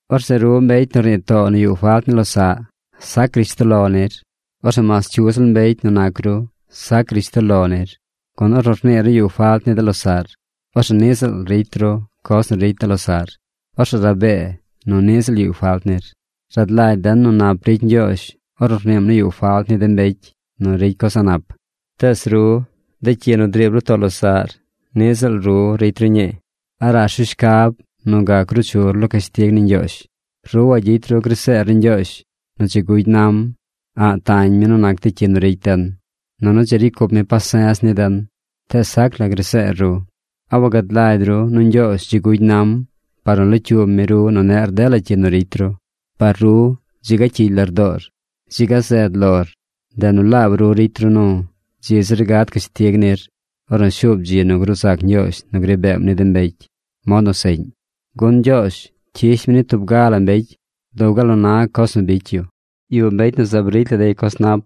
Orzeꞌ ru mbecy nu rnii too nu yuꞌ falt ni losaꞌ, sac rishtoꞌ lo nir. Orzeꞌ mas cyu ziꞌl mbecy nu nac ru, sac rishtoꞌ lo nir, gun ornu rniir nu yuꞌ falt ni de losaꞌr, orzeꞌ niꞌ ziꞌl ricy ru coz nu ricy de losaꞌr, orzeꞌ rabee nu niꞌ ziꞌl yuꞌ falt nir. Rad lagy den nu nap ricy Ñgyoozh ornu rniim nu yuꞌ falt ni de mbecy nu ricy coz a̱ꞌ nap. Tees ru, de cyi nu driib ru too losaꞌr niꞌ ziꞌl ru ricy ru ñii. ¿A rash ru shcab nu gac ruu chur lo cashtig ni Ñgyoozh? Ru wagyicy ru graseer ni Ñgyoozh nu dzi gugy nam. A̱ꞌ tañ mi nu nac de cyi nu ricy den, nunu dzi ricy cup mi pase̱z ni den. Tees sac la graseer ru. ¿A wagad lagy ru nu Ñgyoozh dzi gugy nam par nu locyuub mi ru nu neꞌr dela cyi nu ricy ru? Par ru, dzi ga cyigy lardoor. Dzi ga zed lor. Ndeꞌ nu laab ru ricy ru nu dzi zir gad cashtig nir ornu shuub dzi nu gruu zac Ñgyoozh nu gri beem ni de mbecy mod nu seꞌñ. Gun Ñgyoozh cyish mi ni tub ga la mbecy dub gal nu na coz nu bicy yu. Yuꞌ mbecy nu zaab ricy la dey coz nap.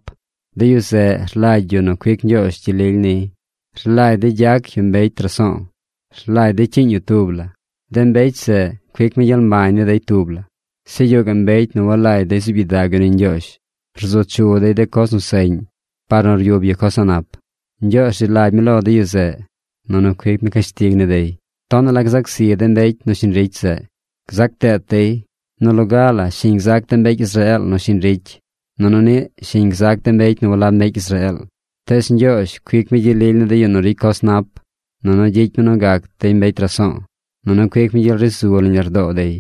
De yu zeꞌ rlagy yu nu cuic Ñgyoozh gyel lily niy. Rlagy dey gyac yu mbecy raso̱o̱. Rlagy dey cyiiñ yu tub la. De mbecy zeꞌ cuic mi gyel mbañ ni dey tub la. Zeꞌ yuꞌ gaꞌ mbecy nu walagy dey zuub gyidag yu ni Ñgyoozh. Rzu chu dey de coz nu seꞌñ par nu ryub yu coz a̱ꞌ nap. Ñgyoozh rzi lagy mi lo de yu zeꞌ, nunu cuic mi cashtig ni dey. Tonaꞌ la gzac zi de mbecy nu shiñ ricy zeꞌ. Gzac deet dey. Nu loga la shiñ gzac de mbecy Israeel nu shiñ ricy, nunu niꞌ shiñ gzac de mbecy nu walab mbecy Israeel. Tees Ñgyoozh cuic mi gyel lily ni de yu nu ricy coz nap, nunu gyicy mi nu gac dey mbecy raso̱o̱, nunu cuic mi gyel ri zu nañ lardoo dey.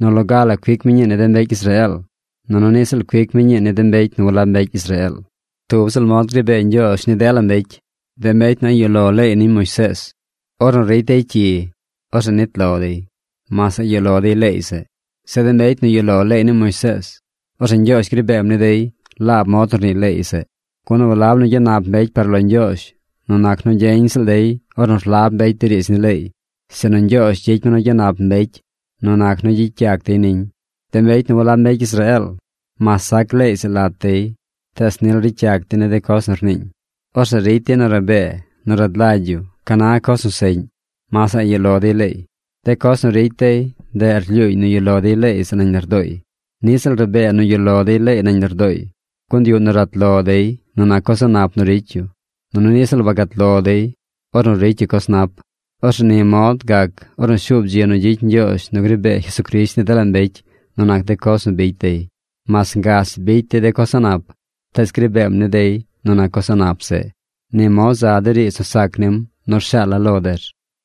Nu loga la cuic mi ñii ni de mbecy Israeel, nunu niꞌ ziꞌl cuic mi ñii ni de mbecy nu walab mbecy Israeel. Tub ziꞌl mod gri bee Ñgyoozh ni dela mbecy. De mbecy nu a̱ꞌ yuꞌ lo leey ni Moisees, ornu ricy dey cyi, orzeꞌ nit lo dey, mas a̱ꞌ yuꞌ lo dey leey zeꞌ. Zeꞌ de mbecy nu yuꞌ lo leey ni Moisees, orzeꞌ Ñgyoozh gri beem ni dey laab mod nu rnii leey zeꞌ. Gun walab nu gyanap mbecy par lo Ñgyoozh nu nac nu gyeñ ziꞌl dey ornu rlab mbecy de riidz ni leey, sinu Ñgyoozh gyicy mi nu gyanap mbecy nu nac nu gyicy yac dey niñ. De mbecy nu walab mbecy Israeel, mas sac leey zeꞌ lat dey tees nil ricy yac dey de coz nu rniiñ. Orzeꞌ ricy dey nu rabee nu rad lagy yu ca na coz nu seꞌñ, mas a̱ꞌ yuꞌ lo dey leey. De coz nu ricy dey, ndeꞌ rlyuuñ nu yuꞌ lo dey leey zeꞌ nañ lardooy. Niꞌ ziꞌl rabee nu yuꞌ lo dey leey nañ lardooy, gun yuꞌ nu rat lo dey nu nac coz a̱ꞌ nap nu ricy yu. Nunu niꞌ ziꞌl wagat lo dey ornu ricy yu coz nap. Orzeꞌ ni mod gac ornu shuub dzi nu gyicy Ñgyoozh nu gri bee Jesucrisht ni dela mbecy nu nac de coz nu bicy dey. Mas ngach bicy dey de coz a̱ꞌ nap, tees gri beem ni dey nu nac coz a̱ꞌ nap zeꞌ. Ni mod za de riidz nu sac nim nu rshaala̱ lo der.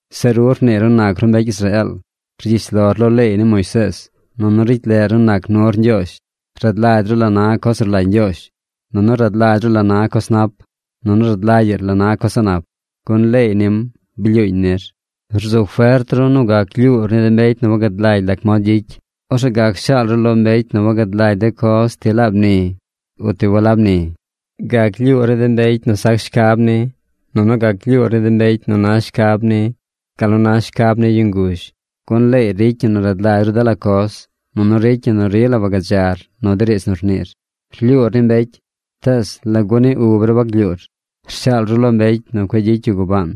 Zeꞌ ru rniir nu nac ru mbecy Israeel. Rgyish lor lo leey ni Moisees, nunu ricy leꞌr nu nac nur Ñgyoozh. Rad lagy ru la na coz nu rlagy Ñgyoozh, nunu rad lagy ru la na coz nap, nunu rad lagyaꞌr la na coz a̱ꞌ nap, gun leey nim blyuuñ nir. Rzu fert ru nu gac lyuur ni de mbecy nu wagad lagy lac mod gyicy. Orzeꞌ gac shaal ru lo mbecy nu wagad lagy de coz ti laab ni, o ti walab ni. Gac lyuur ni de mbecy nu sac shcab ni, nunu gac lyuur ni de mbecy nu na shcab ni gal nu na shcab ni yu nguzh. Gun leey ricy ñi nu rad lagy ru dela coz, nunu ricy ñi nu rila wagadzar nu de riidz nu rniir. Rlyuur ni mbecy, tees ¿lagu ni ub ru waglyuur? Rshaal ru lo mbecy nu cueꞌ gyicy yu gubaan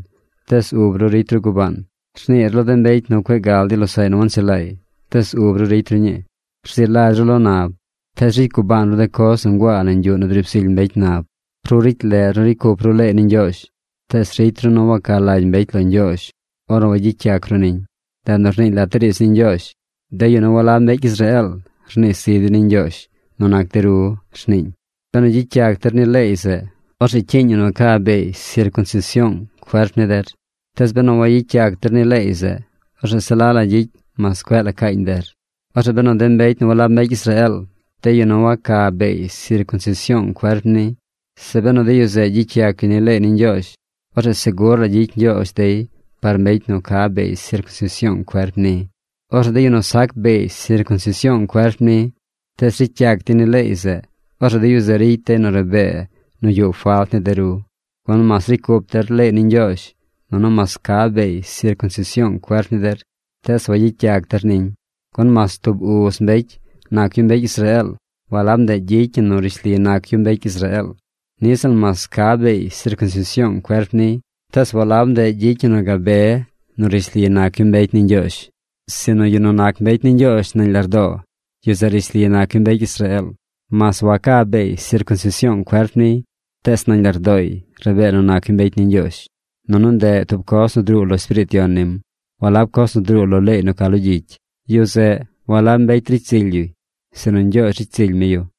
tees ub ru ricy ru gubaan. Rniir lo de mbecy nu cueꞌ gal dey losaꞌy nu wanchelaay, tees ub ru ricy ru ñii. Rzi lagy ru lo nab, tees ricy ru gubaan de coz nu nguaa nañ yuꞌ nu driib zily mbecy nab. Ru ricy leꞌr nu ricy cup ru leey ni Ñgyoozh, tees ricy ru nu waca lagy mbecy lo Ñgyoozh ornu wagyicy yac ru niñ. Ndeꞌ nu rniiñ lat de riidz ni Ñgyoozh: “De yu nu walab mbecy Israeel rnii zi dey ni Ñgyoozh nu nac de ru”, rniiñ. Benu gyicy yac der ni leey zeꞌ, orzeꞌ cyiiñ ñi nu ca beey sircunsision cuerp ni der. Tees benu wagyicy yac der ni leey zeꞌ, orzeꞌ se la la gyicy mas cueꞌ la caañ der. Orzeꞌ benu de mbecy nu walab mbecy Israeel, de yu nu waca beey sircunsision cuerp ni, zeꞌ benu de yu zeꞌ gyicy yac yu ni leey ni Ñgyoozh, orzeꞌ segur la gyicy Ñgyoozh dey par mbecy nu ca beey sircunsision cuerp ni. Orzeꞌ de yu nu sac beey sircunsision cuerp ni, tees ricy yac dey ni leey zeꞌ, orzeꞌ de yu zeꞌ ricy dey nu rabee nu yuꞌ falt ni de ru, gun mas ricy cup der leey ni Ñgyoozh, nunu mas ca beey sircunsision cuerp ni der, tees wagyicy yac der niñ. Gun mas tub uz mbecy nac yu mbecy Israeel, walab ndeꞌ gyicy ñi nu rishli nac yu mbecy Israeel. Niꞌ ziꞌl mas ca beey sircunsision cuerp niy, tees walab ndeꞌ gyicy ñi nu gabe nu rishli nac yu mbecy ni Ñgyoozh. Sinu yu nu nac mbecy ni Ñgyoozh nañ lardoo, yu zeꞌ rishli nac yu mbecy Israeel. Mas waca beey sircunsision cuerp niy, tees nañ lardooy rabee nu nac yu mbecy ni Ñgyoozh. Nunu ndeꞌ tub coz nu druu lo Espiriit Yon nim, walab coz nu druu lo leey nu ca lo gyicy. Yu zeꞌ, walab mbecy ricy zily yuy, sinu Ñgyoozh ricy zily mi yu.